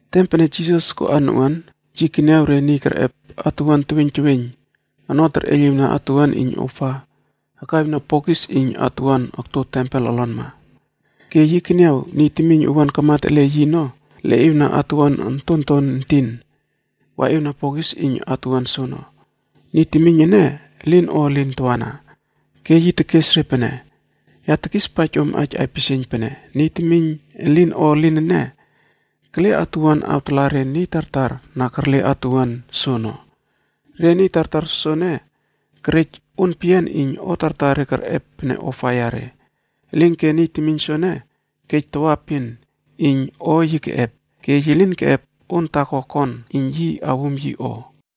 Tem pene Jisas koꞌa noꞌuan, yi keniaw re niy kerꞌep atuwuan teweiyn teweiyn ono terꞌeiyliwna atuwuan iyn ofa akraꞌiwna bokis iyn atuwuana akto tempel olonma. Ke yi keniaw niy temiyn owuan kamat ele yi ono leꞌiwna atuwuan ontonton entin waꞌiwna bokis iyn atuwuan soono. Niy temiyn ene elin o elin tawana. Ke yi tekes re pene, “Ya tekispaij om aij aipisieiyn pene, Niy temiyn elin o elin ene, kele atuwuan awtala re niy tartar na kerle atuwuan soono. Re niy tartar soene kerej on peyian iyn o tartar re kerꞌep pene ofa yare. Elinke niy temiyn soene kej tawaepin iyn o yi keꞌep, ke yi lin keꞌep on taako kon yi iyn yi awum yi o.”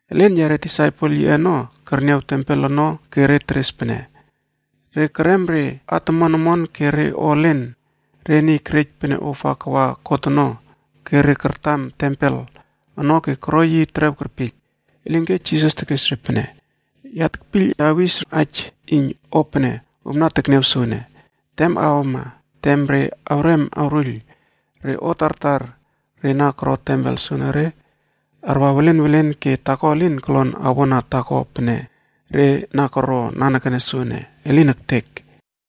Elen yare disaipel yiꞌe ono kerniaw tempel ono ke re teres pene, “Re kerem re at omon omon ke re o elen re niy kerej pene ofa kawa God ono ke re kartam tempel ono ke koro yi terew kerpiyl.” Elinke Jisas tekes re pene, “Ya tekpiyl awis aij iyn o pene om na tekniaw soene, tem awama tem re awrem awruiyl re at tartar re na koro tempel soenere arwa welen welen ke taako elin kolon awona taako pene re na koron nanekene soene. Elin ektek!”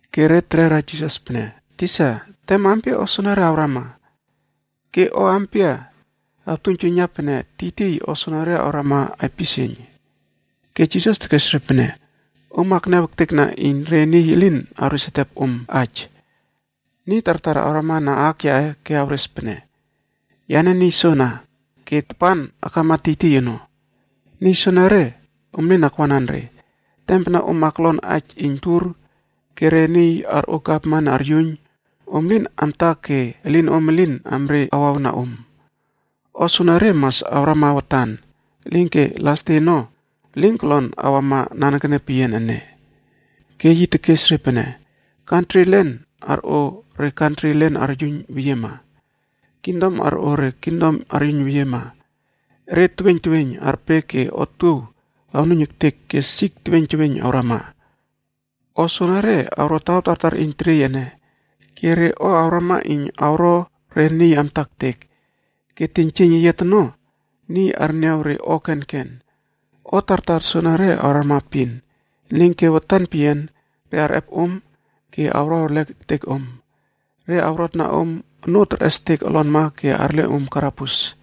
Ke re terera Jisas pene, “Tisa, tem ampia o soenere awrama? Ke o ampia awtuiynjuiyna pene tiytiy o soenere awrama aipisieiyn?” Ke Jisas tekes re pene, “Om akniaw ektekna iyn re niy elin awres ertep om aij. Niy tartar awrama na aak yaꞌe ke awres pene, ‘Yane niy soana,’ ke ‘Tapan akama tiytiy ono.’ Niy soenere, om lin akwanan re. Tem pene om aklon aij iyn tur ke re niy arꞌo gavman aryuiyn, om lin amta ke elinom elin amre awawna om. O soenere mas awrama watan, elinke las de ono, elin kolon awama nanekene peyian ene.” Ke yi tekes re pene, “Kantri elen arꞌo re kantri elen aryuiyn weyiema. kingdom arꞌo re kingdom aryuiyn weyiema. Ere teweiyn teweiyn arpe ke otuow arnuiyn ektek ke sik teweiyn teweiyn awrama. O soenere awro taw tartar iyn teriey ene. Ke re o awrama iyn awro re niy amta ektek. Ke teiynjieiyn eyiat ono, niy arniaw re o kenken. “O tartar soenere awrama epin, elinke watan peyian re arꞌep om ke awro erlek ektek om. Re awrotna om onoo terꞌestek olonma ke arle om karabus.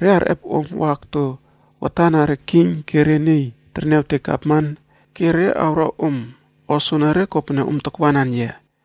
Re arꞌep om wa akto watan na re king ke re niy terniawtek gavman ke re awro om o soenere kopene om takwanan yia.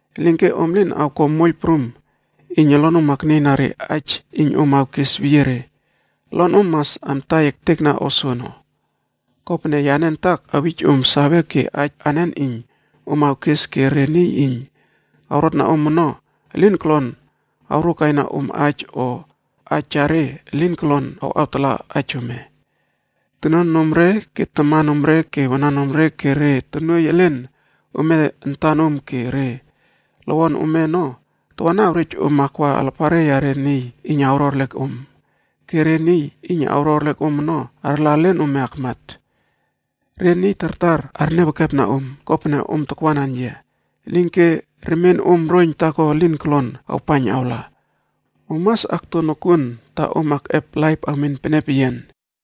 Elinke om lin awko moiyl prum iyn olonom aknieyna re aij iyn om awkes weyie re. Olonom mas amtai ektekna o soono. Kopene, yane antak awij om save ke aij anen iyn om awkes ke re niy iyn awrotna om ono elin kolon awrokaina om aij o aij yare elin kolon awꞌawtala aij ome. Tonuanomre ke tamanomre ke wananomre ke re tonuoiy elen ome antanom ke re lowon ome ono tawana awrej om awa alapare yare niy iyn awro erlek om. Ke re niy iyn awro erlek om ono arla elen ome akmat. Re niy tartar arniaw ekepna om, kopene om takwanan yia. Elinke remienom roiyn taako elin kolon awpaiyn awla. Om mas akto nokuon ta om akꞌep laip awmen pene peyian.”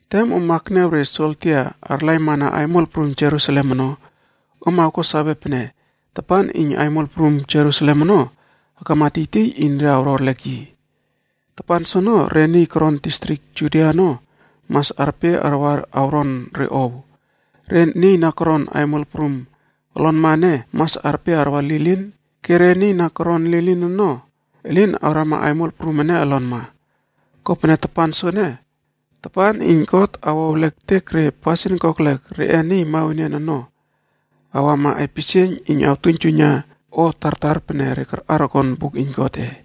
“Tem om akniaw re soldia arlaimana aimol prum Jerusalem ono, om awko sawe pene tapan iyn aimol prum Jerusalem ono akama tiytiy iyn re awro erlek yi. Tapan soono re niy koron distrik Judia ono mas arpe arwa awron re ow. Re niy na koron aimol prum olonma ene mas arpe arwa lilin ke re niy na koron lilin ono elin awrama aimol prum ene olonma. Kopene tapan soene, tapan iyn God awo ewlek ektek re pasin kokelek reꞌe niy mawenian ono, awama aipisieiyn iyn awtuiynjuiyna o tartar pene re karꞌar koron buk iyn Godꞌe.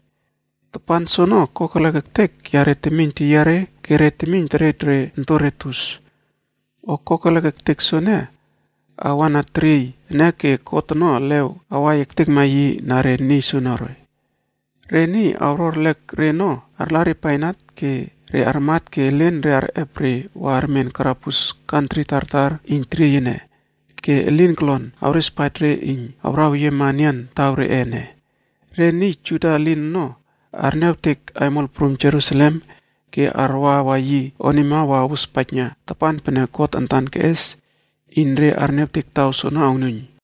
Tapan soono kokelek ektek yare temiyn teyiare ke re temiyn terej re ontore tus. O kokelek ektek soene, awa na teriey ene ke God ono elew awai ektekma yi na re niy soenere. Re niy awro erlek re ono arla re bainat ke re armat ke elen re arꞌep re wa armen karabus kantri tartar iyn teriey ene ke elin kolon awrespaij re iyn awraweyiema enian taw reꞌe ene. Re niy Juda elin ono arniawtek aimol prum Jerusalem ke arwawa yi onima wa awospaijna tapan pene God antan keꞌes iyn re arniawtek taw soono awnuiyn.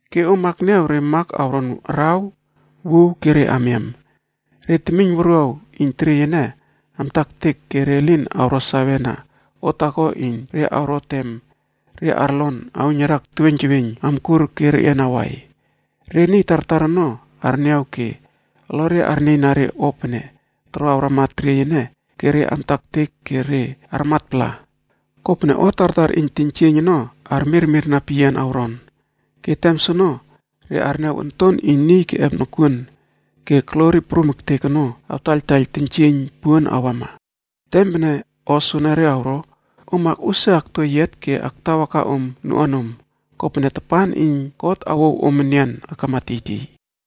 “Ke om akniaw re mak awron araw, wuw ke re amiam. Re temiyn wuruaw iyn teriey ene amta ektek ke re lin awro save na o taako iyn re awro tem re arlon auiynariak teweiyn teweiyn amkur ke reꞌian awai. Re niy tartar ono arniaw ke olore arnieyna re o pene toro awrama teriey ene ke re amta ektek ke re armatpala kopene o tartar iyn teiynjieiyn ono armirmirna peyian awron. Ke tem soono re arniaw Onton iyn Niy keꞌep nokuon ke glori prum ektek ono awtaiyltaiyl teiynjieiyn puon awama. Tem pene o soenere awro, om akꞌusia akto eyiat ke aktawaka om noꞌuanom, kopene tapan iyn God awouw om enian akama tiytiy.”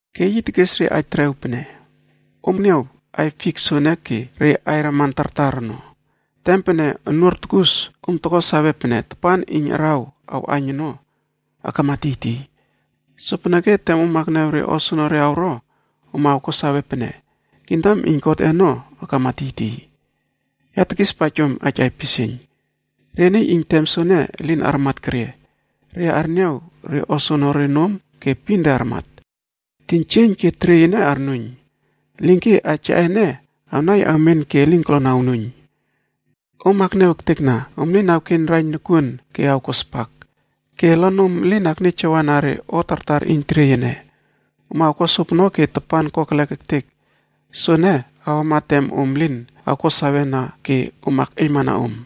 Ke yi tekes re aij terew pene, “Om niaw aiy fik soene ke re aiy raman tartar ono. Tem pene onuor tukus, om toko sawe pene tapan iyn araw awꞌaiyn ono akama tiytiy. Sopeneke tem om akniaw re o soenere awro, om awko sawe pene kingdom iyn Godꞌe ono akama tiytiy. “Ya tekispaij om aij aipisieiyn, re niy iyn tem soene elin armat kerie, re arniaw re o soenere nom ke epin re armat. Teiynjieiyn ke teriey ene arnuiyn, elinke aij yaꞌe ene awnai awmen ke elin kolon awnuiyn. “Om akniaw ektekna, om lin awkeiyn raiyn nokuon ke awko spak, ke olonom elin aknieyjawana re o tartar iyn teriey ene. Om awko sopono ke tapan kokelek ektek soene awama tem om lin awko save na ke om akꞌeiylmana om.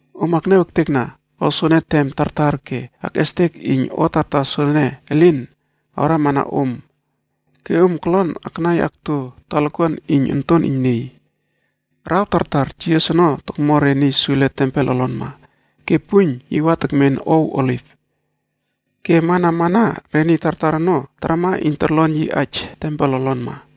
Om akniaw ektekna o soene tem tartar ke akꞌestek iyn o tartar soene elin awrama na om ke om kolon aknai akto talakuan iyn Onton iyn Niy.” Araw tartar Jisas ono tokmo re niy sule tempel olonma. Ke puiyn yi wa tekmen ow Oliv. Ke amana amana re niy tartar ono tarama iyn torlon yi aij tempel olonma.